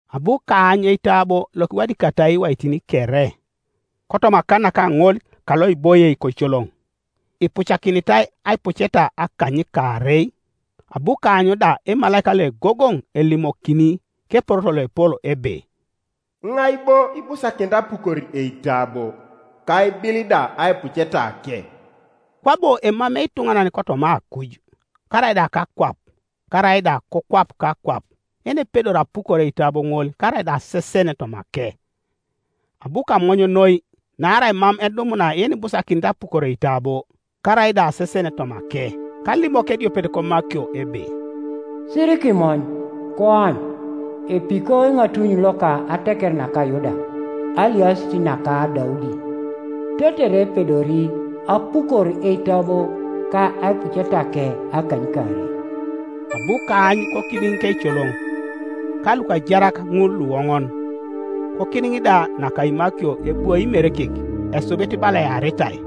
Abu kaany eitabo lokiwadikatai iwaitin kere, kotoma akan naka ŋol kaloiboie koicoloŋ, ipucakinitai aipuceta akanykaarei. Abu kaany da emalaika loegogoŋ elimokini keporoto loepol ebe, “Iŋai bo ibusakinit apukor eitabo, ka aibil da aipucetake?” Kwabo emamei ituŋanan kotoma akuj, karaida kakwap, karaida kokwap kakwap, yenepedori apukor eitabo ŋol karaida asesen tomake. Abu kamony noi, naarai mam edumuna yenibusakinit apukor eitabo, karaida asesen tomake. Kalimok ediopet komakio ebe, “Sirikimony; koany epiko Eŋatuny loka ateker naka Yuda, Aliasit naka Daudi, tetere epedori apukor eitabo ka aipucetake akanykaarei.” Abu kaany kokidiŋ keicoloŋ, ka lukajarak ŋul luoŋon, kokidiŋ da naka imakio ebwoi Imerekek, esubit bala earitai,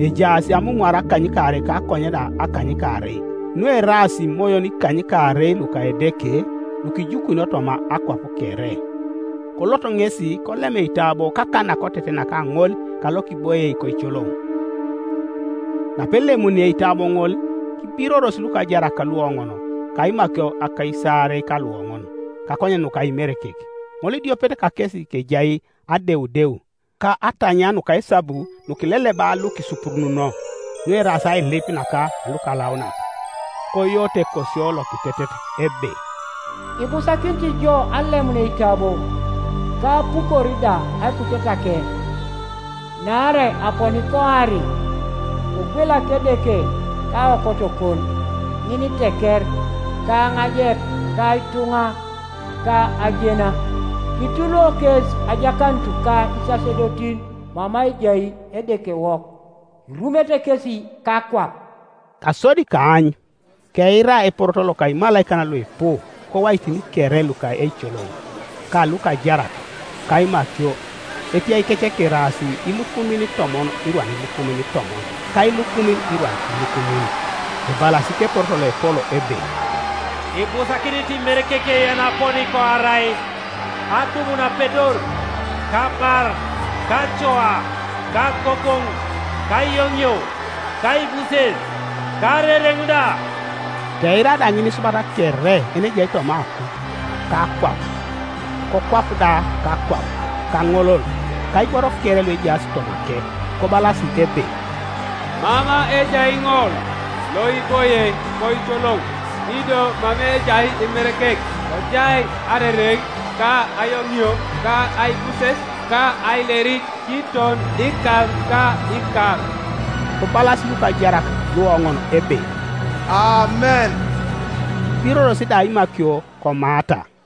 ejaas amumwara akanykaarei ka akonye da akanykaarei, nueraas imoyon ikanykaarei luka Edeke lukijukunio toma akwap kere. Kolot ŋesi kolem eitabo kakan nakoteten naka ŋol kalokiboie koicoloŋ. Napelemuni eitabo ŋol, kibiroros lukajarak luoŋon ka imakio akaisaarei ka luoŋon, kakonyen nuka Imerekek, ŋolidiopet kakesi kejai adeudeu, ka atanyia nuka esabu nukileleba lukisupurununo, nueraas ailip naka lukalaunak; koyooto ekosio lokitetet, ebe, “Ibusakinit ijo alemun eitabo, ka apukor da aipucetake, Naarai aponi koari, kogwelak Edeke kaokotokon ŋiniteker, ka aŋajep, ka ituŋa, ka ajena. Kituluo kes ajakanut ka isasedotin mama ejai Edekewok, Irumete kesi kakwap.” Kasodi kaany, keira eporoto loka imalaikan luipu kowaitin kere luka eicoloŋ, ka lukajarak, ka imakio, etiaikec keraas ilukumin itomon irwan ilukumin itomon ka ilukumin irwan ilukumin, ebalas keporoto loepol ebe, “Ibusakinit Imerekek yenaponi koarai, adumun apedor, ka abar, ka acoa, ka agogoŋ, ka ayoŋio, ka aibuses, ka arereŋ da!” Keira da ŋinisubat kere yenejai toma akuj, ka akwap, kokwap da kakwap, kaŋolol, ka iboro kere luejaas tomake, kobalas ebe, “Mama ejai ŋol loiboie koicoloŋ, ido mama ejai Imerekek, kojai arereŋ, ka ayoŋio, ka aibuses, ka ailerit kiton ikar ka ikar!” Kobalas lukajarak luoŋon ebe, “Amen!” Kibiroros da imakio komaata.